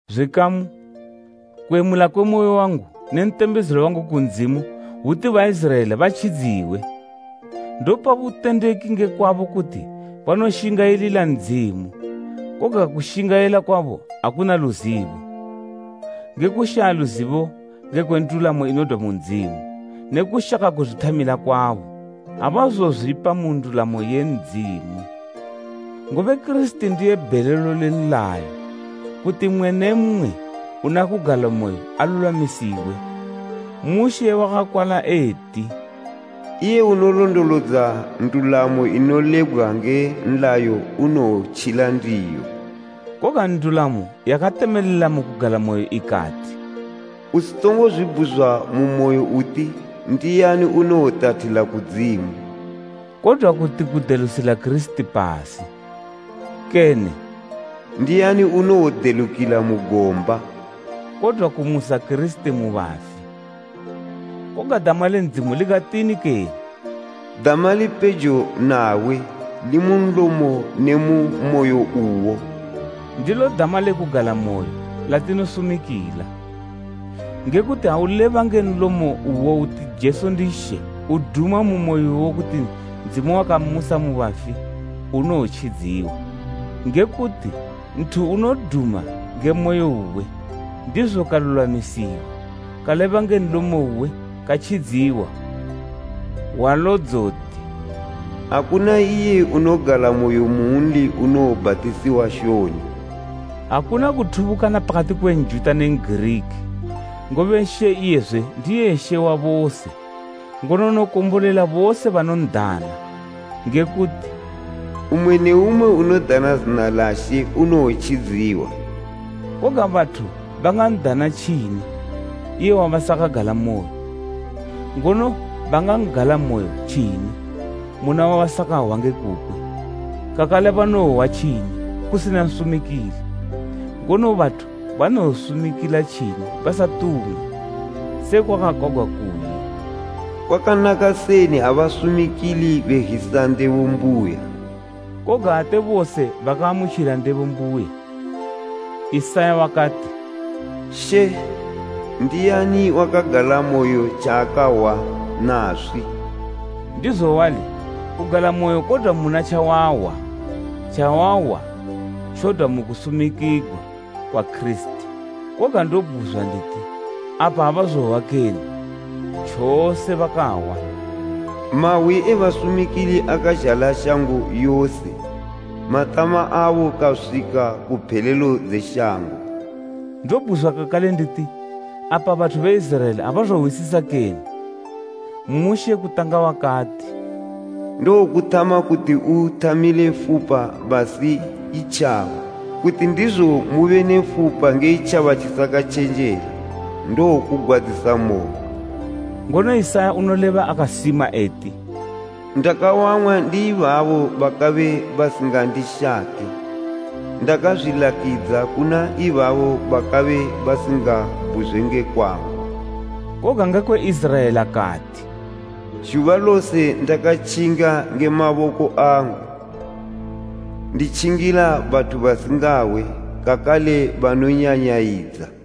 Zwikamu, kuyemula kwe moyo wangu ne ntembezelo wangu ku Ndzimu hwuti Baiziraela batjidziwe. Ndopa butendeki ngekwabo kuti banoshingayilila Ndzimu, koga kushingayila kwabo akuna luzibo. Nge kushaya luzibo ngekwe ndulamo inodwa mu Ndzimu, ne kushaka kuzwithamila kwabo, abazozwipa mu ndulamo ye Ndzimu. Ngobe Kirisiti ndiye bhelelo le nlayo, kuti mmwe ne mmwe unakugalamoyo alulwamisiwe. Mushe wakakwala eti, “Iye unolondolodza ndulamo inolebgwa nge nlayo unowotjila ndiyo.” Koga ndulamo yakatemelela mu kugalamoyo ikati, “Usitongo zwibhuzwa mu moyo uti ndiani, unowotathila kudzimu?” Kodwa kuti kudelusila Kirisiti pasi. Kene “Ndiani unowodelukila mu gomba?” Kodwa kumusa Kirisiti mu bafi. Koga dama le Ndzimu likatini kene? “Dama lipejo nawe, limu nlomo ne mu moyo uwo.” Ndilo dama le kugalamoyo, latinosumikila. Ngekuti ha uleba nge nlomo uwo uti Jesu ndi She uduma mu moyo uwo kuti Ndzimu wakammusa mu bafi, unowotjidziwa. Ngekuti nthu unoduma nge moyo uwe, ndizo kalulwamisiwa, kaleba nge nlomo uwe, katjidziwa. Hwalo dzoti, “Akuna iye unogalamoyo munli unowobhatisiwa shoni.” Akuna kuthubukana pakati kwe Njuta ne N'giriki, ngobe She iyezwe ndiye She wa bose, ngono unokombolela bose banon'dana. Ngekuti, “Mmwe ne mmwe unodana zina la She unowotjidziwa.” Koga bathu bangan'dana tjini iye wabasakagalamoyo? Ngono bangagalamoyo tjini muna wabasakahwa nge kukwe? Kakale banowohwa tjini kusina nsumikili. Ngono bathu banowosumikila tjini basatumwa? Sekwa kwakakwagwa kuyi “Kwakanaka seni ha basumikili be zhisa ndebo mbuya!” Koga ate bose bakaamutjila ndebo mbuya. Isaya wakati, “She, ndiani wakagalamoyo tjaakahwa naswi?” Ndizo wali, kugalamoyo kodwa muna tjawahwa, tjawahwa tjodwa mukusumikigwa kwa Kirisiti. Koga ndobhuzwa nditi: Apa abazohwa kene? Tjose bakahwa! “Mahwi e basumikili akazhala shango yose, matama abo kaswika ku phelelo dze shango.” Ndobhuzwa kakale nditi: Apa bathu be Iziraela abazohwisisa kene? Mushe kutanga wakati, “Ndowokuthama kuti uthamile fupa basi itjaba, kuti ndizo mube ne fupa nge itjaba tjisakatjenjela ndowokugwadzisamoyo.” Ngono Isaya unoleba akasima eti, “Ndakawang'wa ndi ibabo bakabe basingandishake, ndakazwilakidza kuna ibabo bakabe basingabhuzwe nge kwangu.” Koga ngekwe Iziraela kati, “Zhuba lose ndakatjinga nge maboko angu, nditjingila bathu basingahwe kakale banonyanyayidza.”